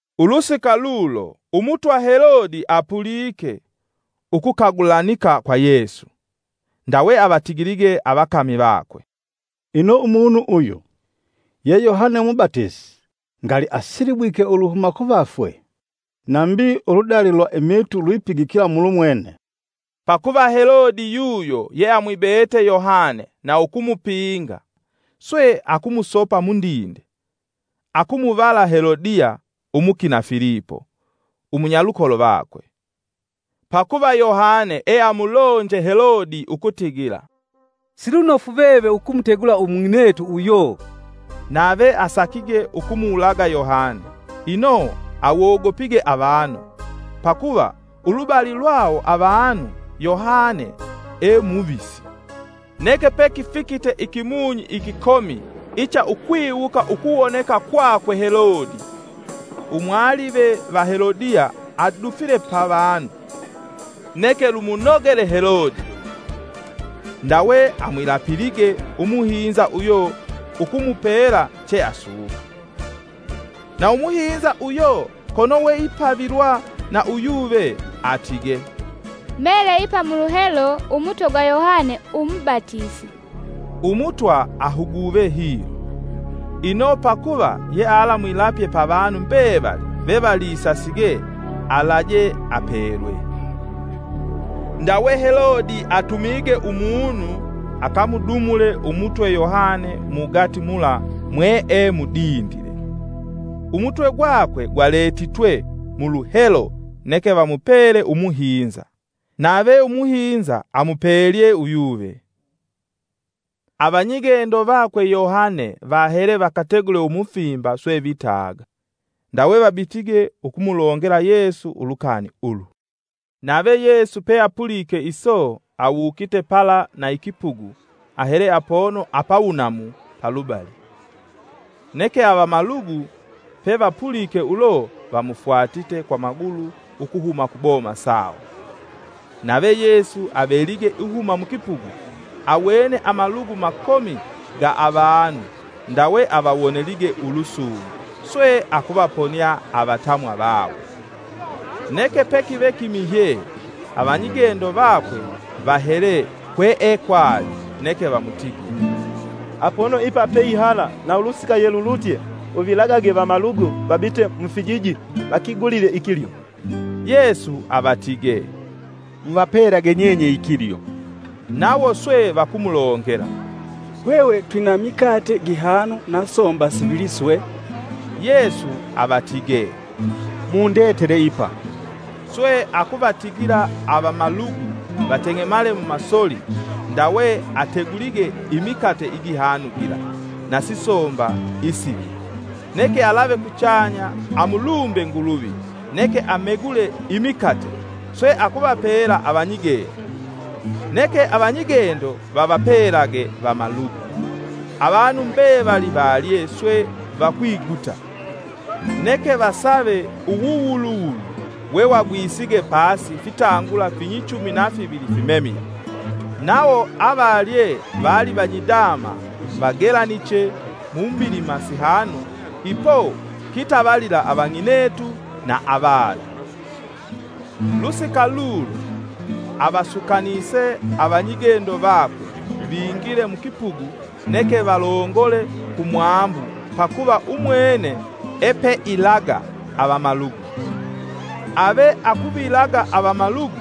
Ulusika lulo, umutwa Helode apulike ukukagulanika kwa Yesu. Ndawe avatigilige avakami vakwe, “Ino umunu uyu, ye Yohane umubatisi, ngali asilibwike uluhuma kuvafwe, nambi uludali lwa imiitu lwipigikila mulumwene.” Pakuva Helode yuyo yeamwibete Yohane na ukumupinga, swe akumusopa mundinde, akumuvala Helodiya, umukina Filipo, umunyalukolo vakwe. Pakuva Yohane eamulonje Helode ukutigila, “Silunofu veve ukumutegula umung'inetu uyo.” Nave asakige ukumuwulaga Yohane, ino awogopige avanu, pakuva ulubali lwawo avanu Yohane e muvisi. Neke pekifikite ikimunyi ikikomi icha ukwiwuka ukuwoneka kwakwe Helode, umwalive va Helodiya adufile pavanu, neke lumunogele Helode. Ndawe amwilapilige umuhinza uyo ukumupela cheasuka. Na umuhinza uyo kono weipavilwa na uyuve atige, “Mele ipa muluhelo umutwe gwa Yohane umubatisi.” Umutwa ahuguve hilo, ino pakuva yealamwilapye pavanu mbevali vevalisasige alaje apelwe. Ndawe Helode atumige umunu akamudumule umutwe Yohane mugati mula mwee mudindile. Umutwe gwakwe gwaletitwe muluhelo neke vamupele umuhinza, nave umuhinza amupelye uyuve. Avanyigendo vakwe Yohane vahele vakategule umufimba swe vitaga. Ndawe vabitige ukumulongela Yesu ulukani ulu. Nave Yesu peapulike iso, awukite pala na ikipugu ahele apono apawunamu palubali. Neke avamalugu pevapulike ulo, vamufwatite kwa magulu ukuhuma kuboma sawo. Nave Yesu avelige ihuma mukipugu, awene amalugu makomi ga avanu, ndawe avawonelige ulusungu swe akuvaponia avatamwa vawo. Neke pekive kimihye avanyigendo vakwe vahele kwekwali neke vamutigile, “Apono ipa peihala na ulusika yelulutye uvilagage vamalugu vabite mufijiji, vakigulile ikilyo.” Yesu avatige, “Muvapelege nyenye ikilyo.” Nawo swe vakumulongela, “Hwehwe twina mikate gihanu na somba sivili swe.” Yesu avatige, “Mundetele ipa.” Swe akuvatigila avamalugu vateng'emale mumasoli ndawe ategulige imikate igihanu gila na sisomba isivili, neke alave kuchanya amulumbe Nguluvi neke amegule imikate sweakuvapela avanyigendo. Neke avanyigendo vavapelage vamalugu. Avanu mbevali valye swe vakwiguta, neke vasave uwuwuluwulu wewagwisige pasi fitangula finyichumi na fivili fimemile. Nawo avalye vali vanyidama vagelaniche mu mbilima sihanu ipo kitavalila avang'inetu na avana. Lusika lulo avasukanise avanyigendo vakwe vingile mukipugu neke valongole kumwambu pakuva umwene epeilaga avamalugu. Ave akuvilaga avamalugu,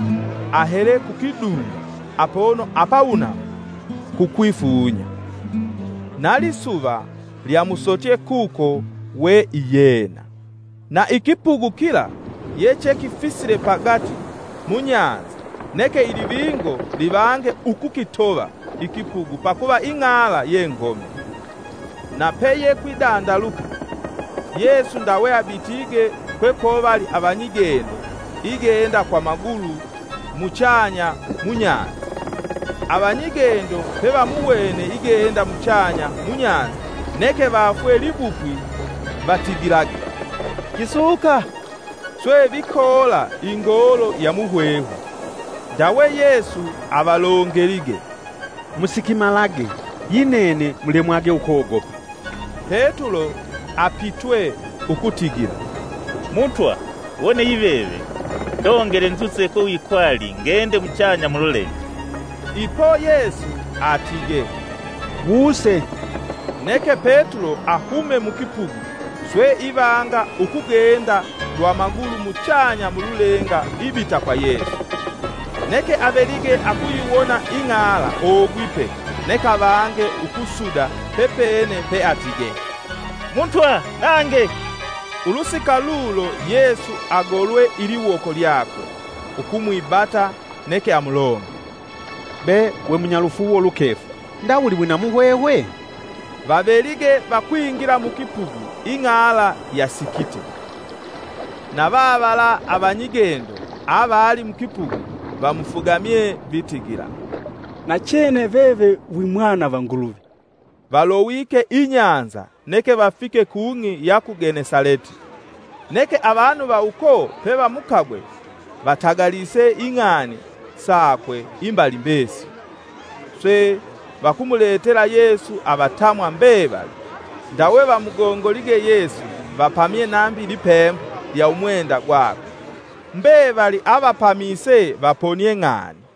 ahele kukidunda apono apawunamu kukwifunya. Na lisuva lyamusotye kuko we iyena. Na ikipugu kila yechekifisile pagati munyanza neke ilivingo livange ukukitova ikipugu pakuva ing'ala yengomi. Na peyekwidandaluka Yesu ndawe abitige kwekovali avanyigendo igenda kwa magulu muchanya munyanza. Avanyigendo pevamuwene igenda muchanya munyanza neke vafwe libupwi vatigilage, “Kisuka.” swe vikoola ingoolo ya muhwehwe. Ndawe Yesu avalongelige, “Musikimalage, yi nene mulemwage ukogopa!” Petulo apitwe ukutigila, “Mutwa wone yiveve, ndongele nzuse kwe wikwali ngende muchanya mululenga.” Ipo Yesu atige, “Wuse.” neke Petulo ahume mukipugu swe ivanga ukugenda lwa magulu muchanya mululenga ibita kwa Yesu. Neke avelige akuyiwona ing'ala ogwipe neke avange ukusuda pepene peatige, “Mutwa nange!” Ulusika lulo Yesu agolwe iliwoko lyakwe, ukumwibata, neke amulongele, “Be we munyalufuuwo lukefu ndawuli wina muhwehwe?” Vavelige vakwingila mukipugu ing'ala yasikite. Na vavala avanyigendo avali mukipugu vamufugamye, vitigila, “Nachene veve wimwana va Nguluvi.” Valowike inyanza neke vafike kung'i ya ku Genesaleti. Neke avanu va uko pevamukagwe vatagalise ing'ani sakwe imbali mbesili. Swe vakumuletela Yesu avatamwa mbevali, ndawe vamugongolige Yesu vapamye nambi lipembo lya umwenda gwakwe, mbevali avapamise vaponie ng'ani.